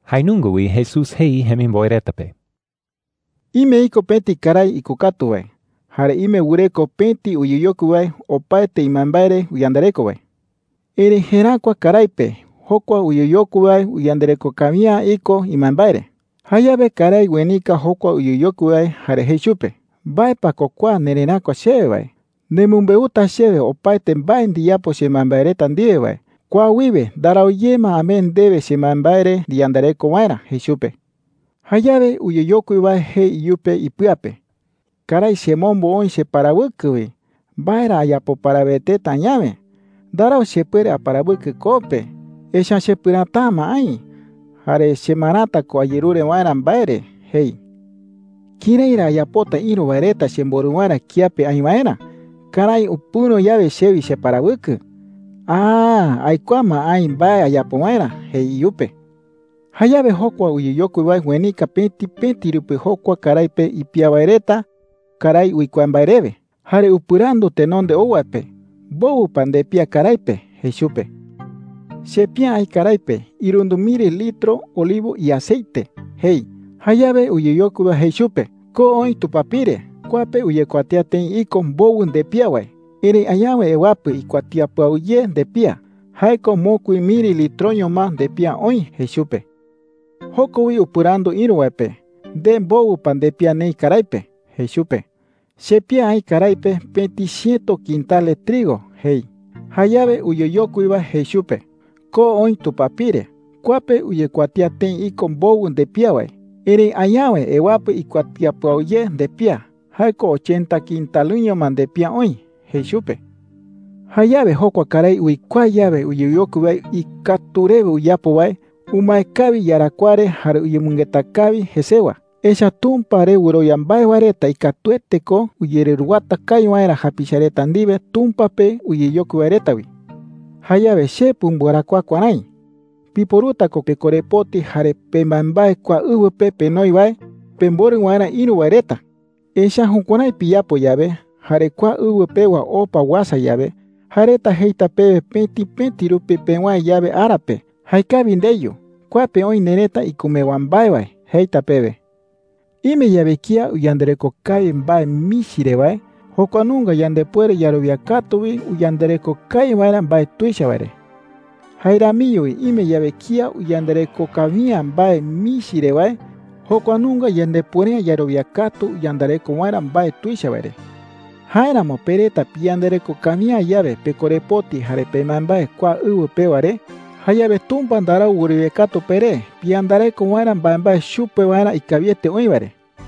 Jae nunga wi Jesús jei jemimboe reta pe: “Ime iko pëti karái ikokatu wae, jare ime wɨreko pëti uyeyokui wae opaete imbaembae re uyandareko wae,” jei. “Erëi jeräkua karái pe jokua uyeyokui wae uyandareko kawi’ä iko imbaembae re. Jayawe karái uenika jokua uyeyokui wae jare jei chupe: “¿Mbae pa ko kua nereräkua chewe wae? Nemɨmbeuta chewe opaete mbae ndiyapo chembaembae reta ndiwe wae. Kua wiwe ndarau ye ma amee ndewe chembaembae re ndiyandareko waerä,’ jei chupe. “Jayawe uyeyokui wae jei iyupe ipɨa pe: ‘Karái chemombo oï cheparawɨkɨ wi. ¿Mbae ra ayapo paraweteta añawe? Ndarau chepuere aparawɨkɨ koo pe, echa’ä chepɨräta’ä ma aï. Jare chemarata ko ayerure waerä mbae re,’ jei. “¿Kërái ra ayapota ïru wae reta chemborɨ waerä kiape aï waerä karái upɨ̈ro yawe chewi cheparawɨkɨ? Aaa. Aikuaa ma aï mbae ayapo waerä,’ jei iyupe. “Jayawe jokua uyeyokui wae uenika pëti pëti rupi jokua karái pe ipía wae reta karái uikuaa mbae rewe. Jare upɨrandu tenonde ou wae pe: “¿Mbowɨ pa ndepía karái pe?’ jei chupe. ‘Chepía aï karái pe irundɨ miri litro olivo iaceite,’ jei. Jayawe uyeyokui wae jei chupe: ‘Ko oï tupapire. Kua pe uyekuatía tëi iko mbowɨ ndepía wae. Erëi añawe ewapɨ ikuatía pɨau ye ndepía – jae ko mokui miri litroño ma ndepía oï,’ jei chupe. Joko wi upɨrandu ïru wae pe: “¿Nde, mbowɨ pa ndepía neï karái pe?’ jei chupe. ‘Chepía aï karái pe pëti chiëto quintale trigo,’ jei. Jayawe uyeyokui wae jei chupe: ‘Ko oï tupapire. Kua pe uyekuatía tëi iko mbowɨ ndepía wae. Erëi añawe ewapɨ ikuatía pɨau ye ndepía – jae ko ochenta quintalɨño ma ndepía oï,’ jei chupe. “Jayawe jokua karái uikuaa yawe uyeyokui wae ikatu rewe uyapo wae, umae kawi iyarakuaa re jare uyemɨngeta kawi jesewa. Echa’ä Tumpa re wɨrowia mbae wae reta ikatuete ko uyereruwata kawi waerä japicha reta ndiwe Tumpa pe uyeyokui wae reta wi,” jei Jesús chupe reta. “Jayawe che pumbɨarakuaa kuärái: Piporuta ko pekorepoti jare pembaembae kua ɨwɨ pe penoi wae pemborɨ waerä ïru wae reta. Echa’ä jukuärái piyapo yawe, jare kua ɨwɨ pewa opa uasa yawe, jae reta jeita pewe pëti pëti rupi pewäe yawe ara pe: ‘¡Jaekawi ndeyu! Kua pe oï nerëta ikumewa mbae wae,’ jeita pewe,” jei. “Ime yawe kía uyandareko kawi mbae michi re wae, jokua nunga yandepuere yarowia katu wi uyandareko kawi waerä mbae tuicha wae re,” jei. “Jae ramiño wi ime yawe kía uyandareko kawi’ä mbae michi re wae, jokua nunga yandepuere’ä yarowia katu uyandareko waerä mbae tuicha wae re,” jei. “Jáeramo pe reta piyandareko kawi’ä yawe pekorepoti jare pembaembae kua ɨwɨ pewa re, jayawe Tumpa ndarau wɨrowia katu peré piyandareko waerä mbaembae chupe waerä ikawiete oï wae re,” jei.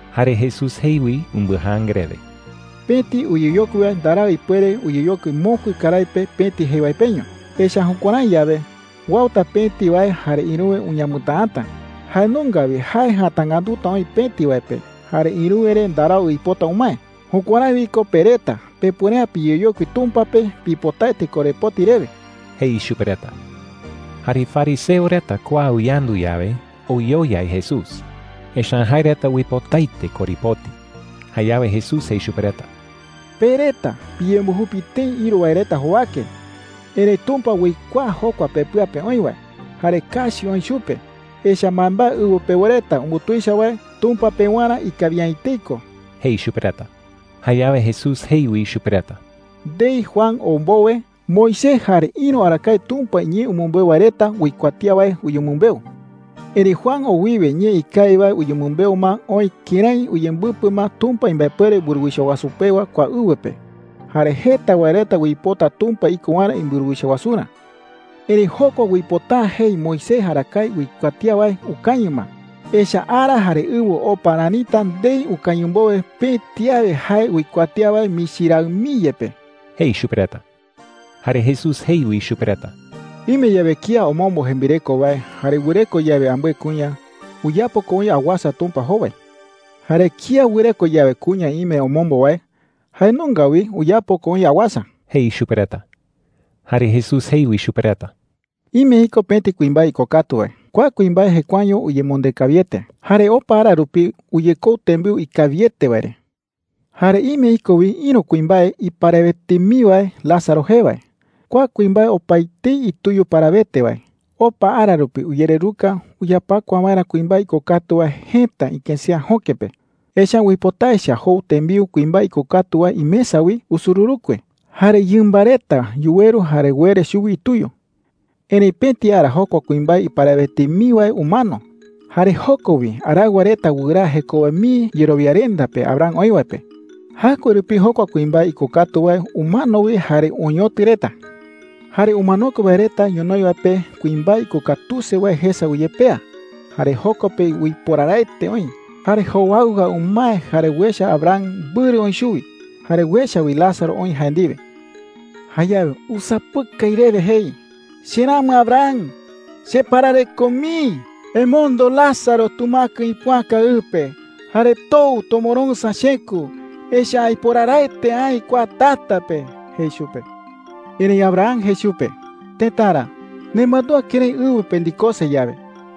Jare Jesús jei wi umbɨjaanga rewe: “Pëti uyeyokui wae ndarau ipuere uyeyokui mokui karái pe pëti jei wae peño. Echa’ä jukuärái yawe, uauta pëti wae jare ïruwe uñamɨtäata. Jae nunga wi jae jatangätuta oï pëti wae pe, jare ïruwe re ndarau uipota umae. Jukuärái wi ko pe reta pepuere’ä piyeyokui Tumpa pe pipotaete korepoti rewe,” jei chupe reta. Jare fariseo reta kua uyandu yawe, oyoyai Jesús. Echa’ä jae reta uipotaete korepoti. Jayawe Jesús jei chupe reta: “Pe reta piyembujupi tëi ïru wae reta jowake. Erëi Tumpa uikuaa jokua pepɨa pe oï wae, jare kachi oï chupe. Echa’ä mbaembae ɨwɨ pewa reta umbutuicha wae, Tumpa pewarä ikawi’ä etei ko,” jei chupe reta. Jayawe Jesús jei wi chupe reta: “Ndei Juan ou mbowe, Moisés jare ïru arakae Tumpa iñee umɨmbeu wae reta uikuatía wae uyemɨmbeu,” jei. “Erëi Juan ou wiwe ñee ikawi wae uyemɨmbeu ma oï kërái uyembɨpɨ ma Tumpa imbaepuere mburuwicha wasu pewa kua ɨwɨ pe. Jare jeta wae reta uipota Tumpa iko waerä imburuwicha wasurä,” jei. “Erëi jokua uipota’ä jei Moisés arakae uikuatía wae ukañɨ ma. Echa’ä ara jare ɨwɨ opa ranita ndei ukañɨ mbowe pëti awe jae uikuatía wae michi raɨ mii yepe,” jei chupe reta. Jare Jesús jei wi chupe reta: “Ime yawe kía omombo jembireko wae, jare wɨreko yawe ambɨe kuña, uyapo ko oï awasa Tumpa jowai,” jei. “Jare kía wɨreko yawe kuña ime omombo wae, jae nunga wi uyapo ko oï awasa,” jei chupe reta. Jare Jesús jei wi chupe reta: “Ime iko pëti kuimbae ikokatu wae. Kua kuimbae jekuaeño uyemonde kawiete, jare opa ara rupi uyekou tembiu ikawiete wae re,” jei. “Jare ime iko wi ïru kuimbae iparawete mii wae Lázaro jee wae. Kua kuimbae opaetei ituyu parawete wae. Opa ara rupi uyereruka uyapakua waerä kuimbae ikokatu wae jëta ikësea jöke pe. Echa’ä uipota echa jou tembiu kuimbae ikokatu wae imesa wi usururukue. Jare yɨmba reta yuweru jare uere chuwi ituyu,” jei. “Erëitu pëti ara jokua kuimbae iparawete mii wae umano, jare joko wi araɨwa reta wɨraa jekowe mii yerowiarenda pe Abraham oï wae pe. Jaɨkue rupi jokua kuimbae ikokatu wae umano wi jare oñotɨ reta,” jei. “Jare umanokue wae reta ñonoï wae pe kuimbae ikokatuse wae jesa uyepea, jare joko pe uiporaraete oï. Jare jowaɨwa umae jare uecha Abraham mbɨrɨ oï chuwi. Jare uecha wi Lázaro oï jae ndiwe,” jei. “Jayawe usapɨkai rewe jei: ‘Cheramɨ Abraham, cheparareko mii. Emondo Lázaro tumäkɨ ipoäka ɨ pe jare tou tomoroɨ̈sa chekü. Echa’ä aiporaraete aï kua tata pe,’ jei chupe. “Erëi Abraham jei chupe: ‘Tëtara, nemandúa kërái ɨwɨ pe ndikose yawe,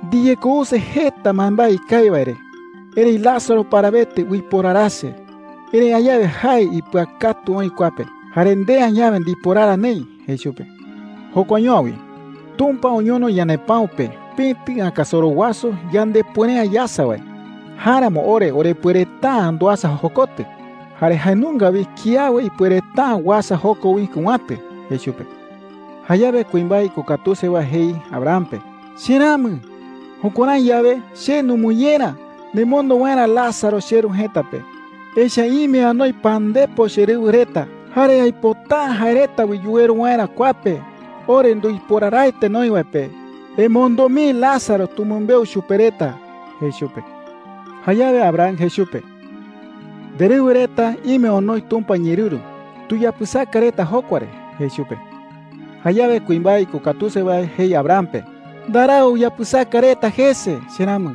ndiyekouse jeta mbaembae ikawi wae re. Erëi Lázaro parawete uiporarase. Erëi añawe jae ipɨakatu oï kua pe, jare nde añawe ndiporara neï,’ jei chupe. ‘Jokuaño’ä wi. Tumpa oñono ñanepäu pe pëti ɨäkasoro wasu yandepuere’ä yasa wae. Jáeramo ore orepuereta’ä nduasa jokotɨ, jare jae nunga wi kiawe ipuereta’ä uasa joko wi kɨ̈watɨ,’ jei chupe. “Jayawe kuimbae ikokatuse wae jei Abraham pe: ‘Cheramɨ, jukuärái yawe, che numɨñera nemondo waerä Lázaro cheru jëta pe. Echa’ä ime anoi pandepo cherɨwɨ reta, jare aipota’ä jae reta wi yuweru waerä kua pe ore nduiporaraete noï wae pe. Emondo mii Lázaro tumɨmbeu chupe reta,’ jei chupe. “Jayawe Abraham jei chupe: ‘Nderɨwɨ reta ime onoi Tumpa iñeerɨru. Tuyapɨsaka reta jokua re,’ jei chupe. “Jayawe kuimbae ikokatuse wae jei Abraham pe: ‘Ndarau uyapɨsaka reta jese, cheramɨ.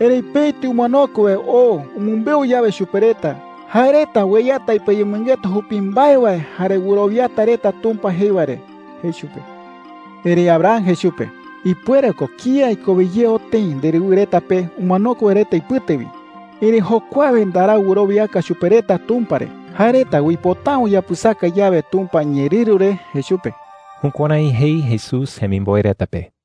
Erëi pëti umanokue wae oo umɨmbeu yawe chupe reta, jae reta ueyata ipɨayemɨngeta jupi mbae wae jare wɨrowiata reta Tumpa jei wae re,’ jei chupe. “Erëi Abraham jei chupe: ‘Ipuere ko kía ikowe ye oo tëi nderɨwɨ reta pe umanokue wae reta ipɨte wi. Erëi jokuawe ndarau wɨrowiaka chupe reta Tumpa re, jae reta uipota’ä uyapɨsaka yawe Tumpa iñeerɨru re,’ jei chupe.” Jukuärái jei Jesús jemimboe reta pe.